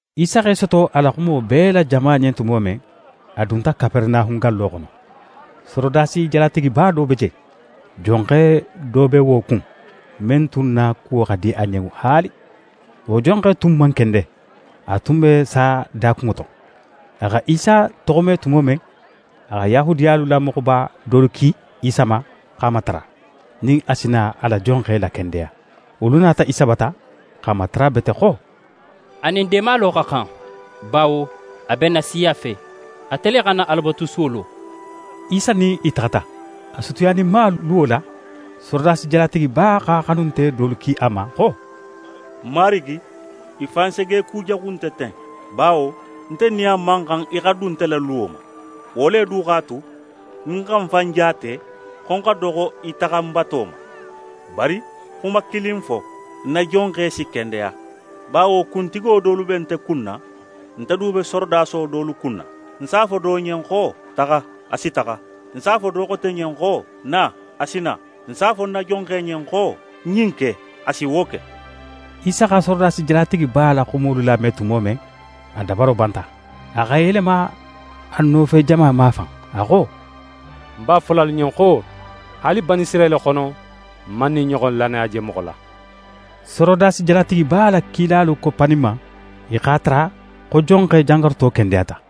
Isa x'e soto a la xumo bee la jama ɲen tumo men, a dunta Kaperenahun gallo xono. Sorodasi jalatigiba do be je, jonxe do be wo kun, men tun na kuwo xa di a ɲen haali. Wo jonxe tun man kende, a tun be saya dakunŋo to. A xa Isa toxome tumo men, a xa Yahudiyalu la moxoba dolu ki Isa ma x'a matara, nin a si na a la jonxe lakendeya. Wolu nata Isa bata, x'a matara bete xo: «A nin deemalo xa xan, bawo a be n na siya fe, ate le xa n na Alabatusuwo lo.» Isa nin i taxata, a sutiyaninma luwo la, sorodasi jalatigiba x'a xanunte dolu ki a ma xo: «Marigi, í fan segekujaxu nte ten, bawo nte nin a man xan í xa dun nte la luwo ma. Wo le du x'a tu nin ń xa ń fan jaate xo ń xa doxo í taxanbato ma. Bari xuma kilin fo, ń na jonxe si kendeya. Bawo kuntigo dolu be nte kunna, nte du be sorodaso dolu kunna. Ń s'a fo do ɲen xo: “Taxa,” a si taxa. Ń s'a fo do xote ɲen xo: “Na,” a si na. Ń s'a fo ń na jonxe ɲen xo: “Ɲin ke,” a si wo ke.» Isa xa sorodasi jalatigiba la xumolu lame tumo men, a dabaro banta. A x'é yelema a nofejama mafan, a xo: «Ń b'a fola alu ɲen xo: Haali Banisirayila xono, ń man ɲin ɲoxon lannaya je moxo la.» Sorodasi jalatigiba la kilalu koppaninma, i x'a tara xo jonxe jangaruto kendeyata.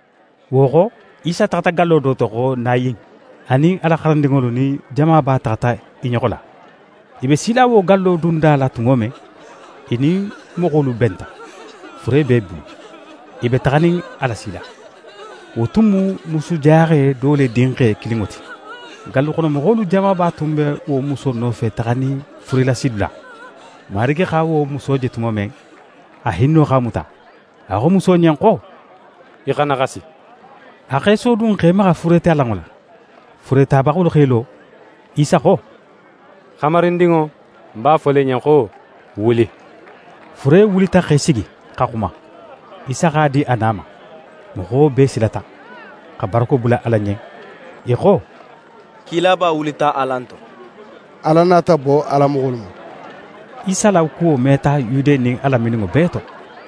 Wo xo, Isa taxata gallo do to xo Nayin. A nin a la xarandinŋolu nin jamaba taxata i ɲoxo la. I be sila wo gallo dunda la tumo men, i nin moxolu benta, fure be i bulu, i be taxanin a lasila. Wo tun mu musujaxe do le dinxe kilinŋo ti. Galluxonomoxolu jamaba tun be wo muso nofe taxanin furelasidula. Marigi xa wo muso je tumo men, a hinno x'a muta. A xo muso ɲen xo: «Í xana xasi!» A x'é sodun x'é maxa furetalanŋo la. Fure tabaxolu x'e lo. Isa xo: «Xamarindinŋo, ń b'a fola í ɲen xo: Wuli!» Fure wulita x'é sigi, xa xuma. Isa x'a di a na ma. Moxo bee silata, xa barako bula Ala ɲen. I xo: «Kilaba wulita alan to. Ala nata bo a la moxolu ma.» Isa la wo kuwo meta Yude nin a lamininŋo bee to.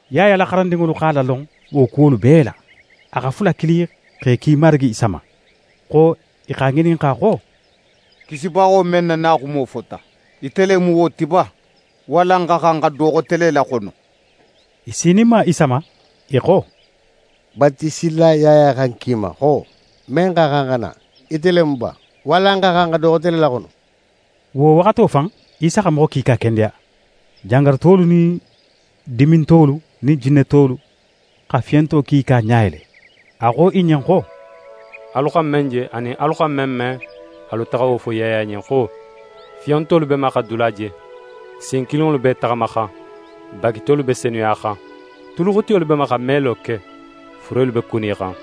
Yaya la xarandinŋolu x'a lalon wo kuwolu bee la. A xa fula kili x'e ki Marigi Isa ma, xo i x'a ŋininxa xo: «Kisibaxo men na naxumo fota, ite le mu wo ti ba, walla n xa xan xa do xote le laxono?» I sininma Isa ma, i xo: «Batiselila Yaya xa n ki i ma xo, men xa xan xa na, ite le mu ba, walla n xa xan xa do xote le laxono?» Wo waxato fan, Isa xa moxo kiika kendeya: Jangarutolu nin dimintolu nin jinnetolu, xa fiyonto kiika ɲa yele. A xo i ɲen xo: «Alu xa men je, anin alu xa men me, alu taxa wo fo Yaya ɲen xo: “Fiyontolu be ma xa dula je, sin kilinŋolu b'e taxamaxan, bagitolu be senuyaxan, tuluxutiyolu be ma xa melo ke, furelu be kunixan,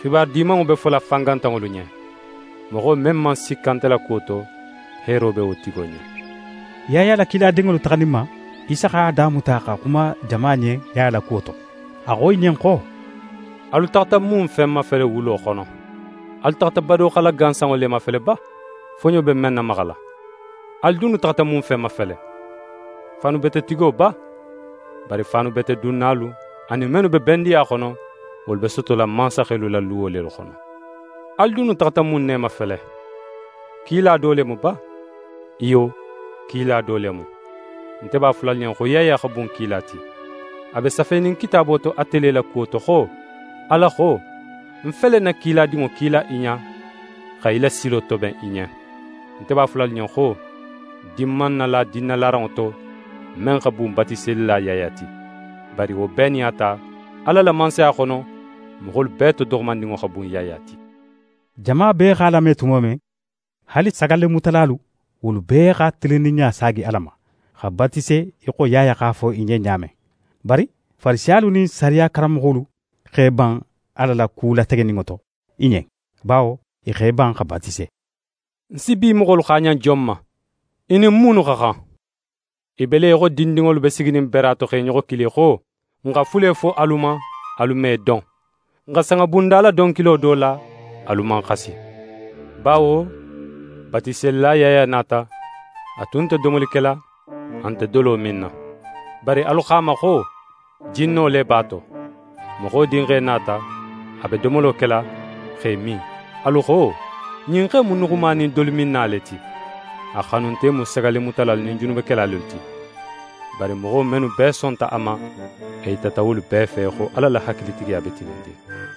xibaru Dimanŋo be fola fangantanŋolu ɲen.” Moxo men man sikka nte la kuwo to, heero be wo tigo ɲen.» Yaya la kiladinŋolu taxaninma, Isa x'a damuta xa xuma jama ɲen Yaya la kuwo to. A xo i ɲen xo: «Alu taxata mun fen mafele wulo xono? Alu taxata badoxala gansanŋo le mafele ba, foɲo be men namaxala? Alu dunnu taxata mun fen mafele? Faanubetetigo ba? Bari faanubetedunnalu, anin mennu be bendiya xono, wolu be sotola mansaxelu la luwo lelu xono. Alu dunnu taxata mun ne mafele? Kila do le mu ba? Iyo, kila do le mu. Nte b'a fola alu ɲen, xo Yaya xa bun kila ti. A be safenin Kitaabo to ate le la kuwo to xo: Ala xo: “Ń fele ń na kiladinŋo kila í ɲa, xa í la silo toben í ɲen.” «Nte b'a fola alu ɲen xo: Din man nala dinnalaranŋo to, men xa bun Batiselila Yaya ti. Bari, wo bee nin a ta, Ala la Mansaya xono, moxolu bee to doxomandinŋo xa bun Yaya ti. Jama bee x'a lame tumo men, haali sagallemutalalu, wolu bee xa tilinninɲa saagi Ala ma, xa batise í xo Yaya x'a fo i ɲen ɲa men. Bari Farisiyalu nin sariya karanmoxolu x'e ban Ala la ku lategeninŋo to i ɲen, bawo i x'e ban xa batise. «Ń si bi moxolu xaaɲan jon ma? I nin munnu xa xan? I be le í xo dindinŋolu be siginin bera to, x'e ɲoxo kili xo: “N xa fule fo alu ma, alu man i don. N xa sanŋabundala donkilo do la, alu man xasi.” Bawo Batiselila Yaya nata, a tun nte domoli kela, a nte dolo minna. Bari alu xo a ma xo: “Jinno le b'a to.” Moxo Dinxe nata, a be domolo kela, x'é min, alu xo: “Ɲin xe in mu nuxuma nin dolominna le ti. A xanunte mu sagallemutalalu nin junubekela lelu ti.” Bari moxo mennu bee sonta a ma, a yitata wolu bee fe xo Ala la hakilitigiya be tilinnin.»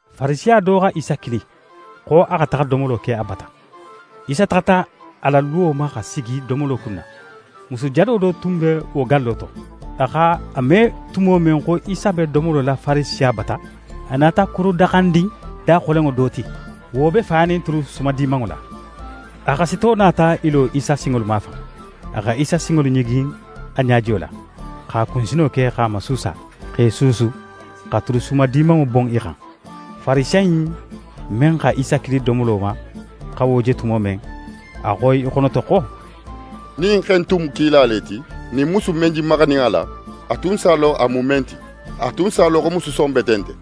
Farisiya do xa Isa kili, xo a xa taxa domolo ke a bata. Isa taxata a la luwo ma xa sigi domolo kunna. Musu jado do tun be wo gallo to. A x'a me tumo men xo Isa be domolo la Farisiya bata, a nata kurudaxandin daxolenŋo do ti. Wo be fanin tulu sumadimanŋo la. A xasito nata í lo Isa sinŋolu mafan. A xa Isa sinŋolu ɲigin a ɲajiyo la, x'a kunsino ke x'e masuusa, x'e suusu, xa tulu sumadimanŋo bon i xan. Farisiya in men xa Isa kili domolo ma xa wo je tumo men, a xo í xonoto xo: «Nin ɲin xe in tun mu kila le ti, ɲin musu in men je maxanin a la, a tun s'a lon a mu men ti. A tun s'a lon xo musu son bete nte.»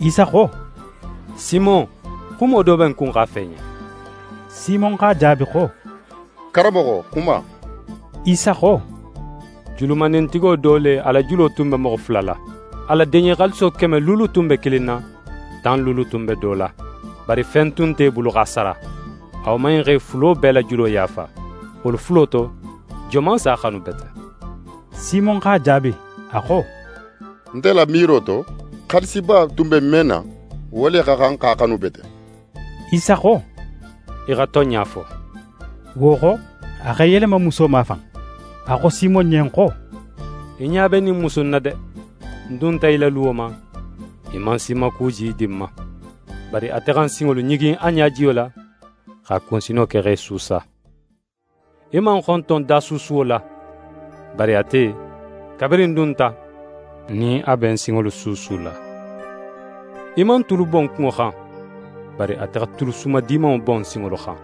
Isa xo: «Simon, xumo do be ń kun x'a fo í ɲen.» Simon x'a jaabi xo: «Karanmoxo, xuma.» Isa xo: «Julumandintigo do le, a la julo tun be moxo fula la. A la deɲe xaaliso keme luulu tun be kilin na, tan luulu tun be do la. Bari fen tun nte i bulu x'a sara. A woman in x'e fulo bee la julo yaafa. Wolu fulo to, joman s'a xanu bete?» Simon x'a jaabi, a xo: «Nte la miiro to, xaalisiba tun be men na, wo le xa xan x'a xanu bete.» Isa xo: «Í xa tonɲa fo!» Wo xo, a x'é yelema muso mafan, a xo Simon ɲen xo: «Í ɲa be ɲin musu in na de? Ń dunta í la luwo ma, í man sinmakuji di ń ma, bari ate xa ń sinŋolu ɲigin a ɲajiyo la, x'a kunsino ke x'e suusa. Í man ń xonton dasuusuwo la, bari ate, kabirin ń dunta, nin a be ń sinŋolu suusula. Í man tulu bon ń kunŋo xan, bari ate xa tulu sumadimanŋo bon ń sinŋolu xan.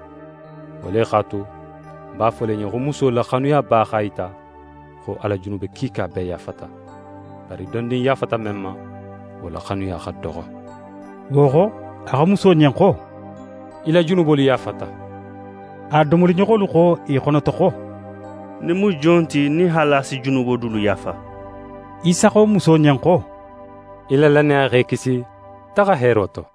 Wo le x'a tu, ń b'a fola í ɲen, xo muso la xanuyaba x'a yita, xo a la junube kiika bee yaafata. Bari dondin yaafata men ma, wo la xanuya xa doxo.» Wo xo, a xo muso ɲen xo: «Í la junubolu yaafata.» A domoliɲoxolu xo i xonoto xo: «Ɲin mu jon ti nin haali a si junubo dulu yaafa?» Isa xo muso ɲen xo: «Í la lannaya x'é kisi: Taxa heero to.»